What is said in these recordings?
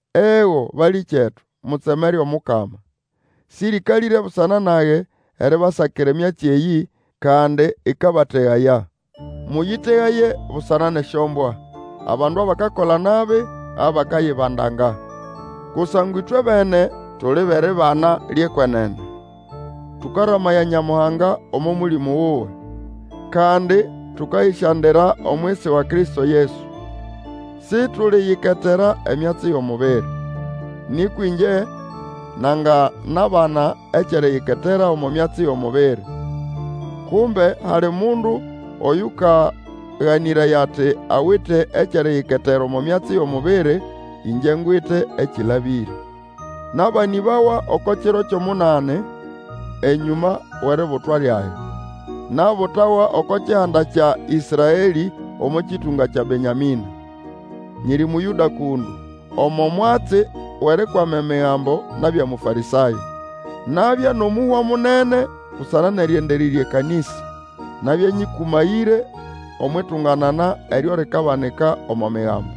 Ego, balĩkyetu, mutsemere Omukama! Sĩrĩkalĩre busana nage eribasakira emyatsi eyĩ, kandi ĩkabategaya. Mũyĩtegaye busana nʼesyombwa, abandu abakakola nabi, abakayibandanga. Kusangwa ĩtwebene tuli bʼeribana lyʼekwenene, tũkaramaya Nyamuhanga omo Mũlĩmũ wuwe, kandi tũkayĩsyandira omwisi wa Kristo Yesu. Situliyiketera emyatsi yʼomubiri. Nĩkwa ĩngye nanganabana ekyʼeriyiketera omo myatsi yʼomubiri. Kumbe hali mundu oyũkaganĩraya ati awite ekyʼeriyiketera omo myatsi yʼomubiri, ĩngye ngwite ekĩlabĩre. Nabanĩbawa oko kiro kyʼomunani enyũma wʼeributwa lyage. Nabutawa oko kihanda kya Ĩsraelĩ omo kĩtũnga kya Benyamĩna. Nyiri Mũyũda kũndũ. Omo mwatsi wʼerikwama Emigambo nabya Mũfarĩsayo. Nabya nʼomũhwa munene busana nʼerĩendererya ekanĩsa. Nabya nyĩkũmayĩre omwʼitunganana eryo likabanika omo Migambo.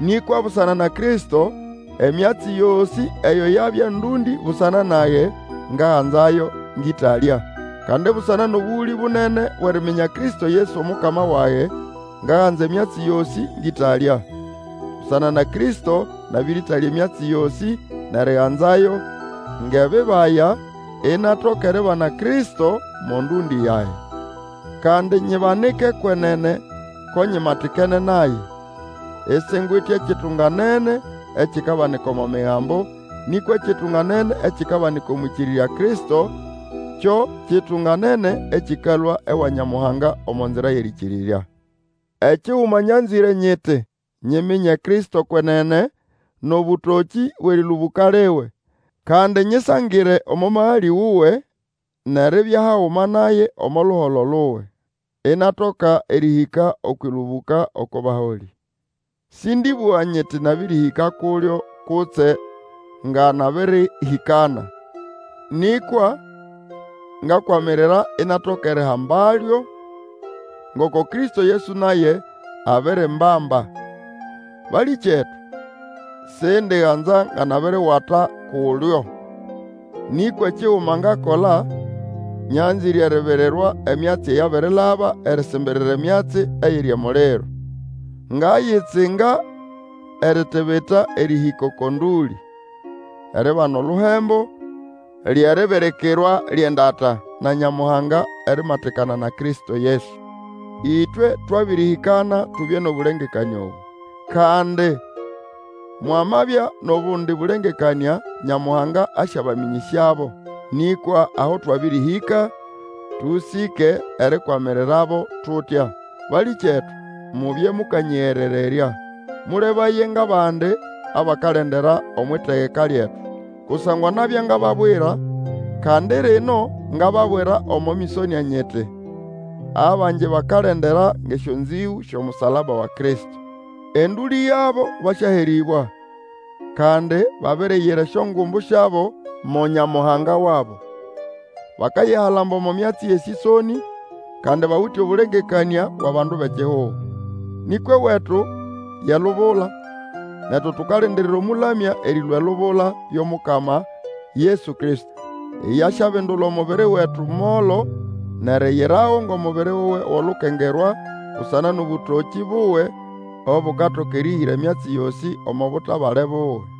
Nĩkwa busana na Kristo, emyatsi yosĩ eyo yabya ndũndĩ busana nage, ngaganzayo ngʼĩtalya. Kandi busana nʼobũgũlĩ bunene bwʼeriminya Kristo Yesu Omukama wage, ngaganza emyatsi yosĩ ngʼĩtalya. Busana na Kristo nabĩrĩtalya emyatsi yosĩ nʼeriganzayo ngʼebibaya, inatoka eribana Kristo mo ndũndĩ yage. Kandi nyibanike kwenene ko nyimatikene naye, isingwite ekitunganene ekikabanika omo Migambo, nĩkwa ekitunganene ekikabanika omwʼĩkĩrĩrya Kristo, kyo kitunganene ekĩkalũa ewa Nyamuhanga omo nzira yʼerĩkĩrĩrya. Ekiguma nyanzĩre nyiti, nyiminye Kristo kwenene, nʼobũtokĩ bwʼerĩlũbũka liwe, kandi nyĩsangĩre omo magalĩ wuwe, nʼeribya haguma naye omo luholo luwe. Inatoka erĩhĩka okwʼĩlũbũka oko baholĩ. Sĩndĩbũga nyiti nabĩrĩhĩka kulyo kutse nga nabĩrĩhĩkana, nĩkwa ngakwamirira inatoka erihambalyo ngoko Kristo Yesu naye abirimbamba. Balĩkyetu, sindiganza nga nabiriwata kulyo, nĩkwa ekiguma ngakola; nyanzĩre eribirirwa emyatsi eyabirilaba, erisimbirira emyatsi eyiri emuliro. Ngayitsinga eritibita erĩhĩka oko ndũlĩ, eribana oluhembo, lye ribirikirwa lyʼendata na Nyamuhanga erimatikana na Kristo Yesu. Ĩtwe twabĩrĩhĩkana tubye nʼobũlengekanĩa obũ. Kandi mwamabya nʼobundi bũlengekanĩa, Nyamuhanga asyabamĩnyĩsyabo. Nĩkwa aho twabĩrĩhĩka, tũsĩke erikwamirirabo tutya. Balĩkyetu, mubye mũkanyĩgerererya. Mũlebaye ngʼabandi abakalendera omwʼitegeka lyetu. Kusangwa nabya ngababwira, kandi rino ngababwira omo mĩsonĩa nyiti, abangi bakalendera ngʼesyonzĩgũ syʼomusalaba wa Kristo. Endũlĩ yabo basyaherĩbwa, kandi babiriyira esyongumbu syabo mo nyamuhanga wabo. Bakayihalamba omo myatsi yʼesĩsonĩ, bandu bʼekihugo. Nĩkwa ewetu ye lubula, netu tukalindirira Omũlamya erĩlũa elubula, yo Mukama Yesu Kristo. Iye asyabindula omubiri wetu molo, nʼeriyirago ngʼomubiri wuwe wʼolukengerwa, busana nʼobũtokĩ buwe obukatoka erĩhĩra emyatsi yosĩ omo butabale buwe.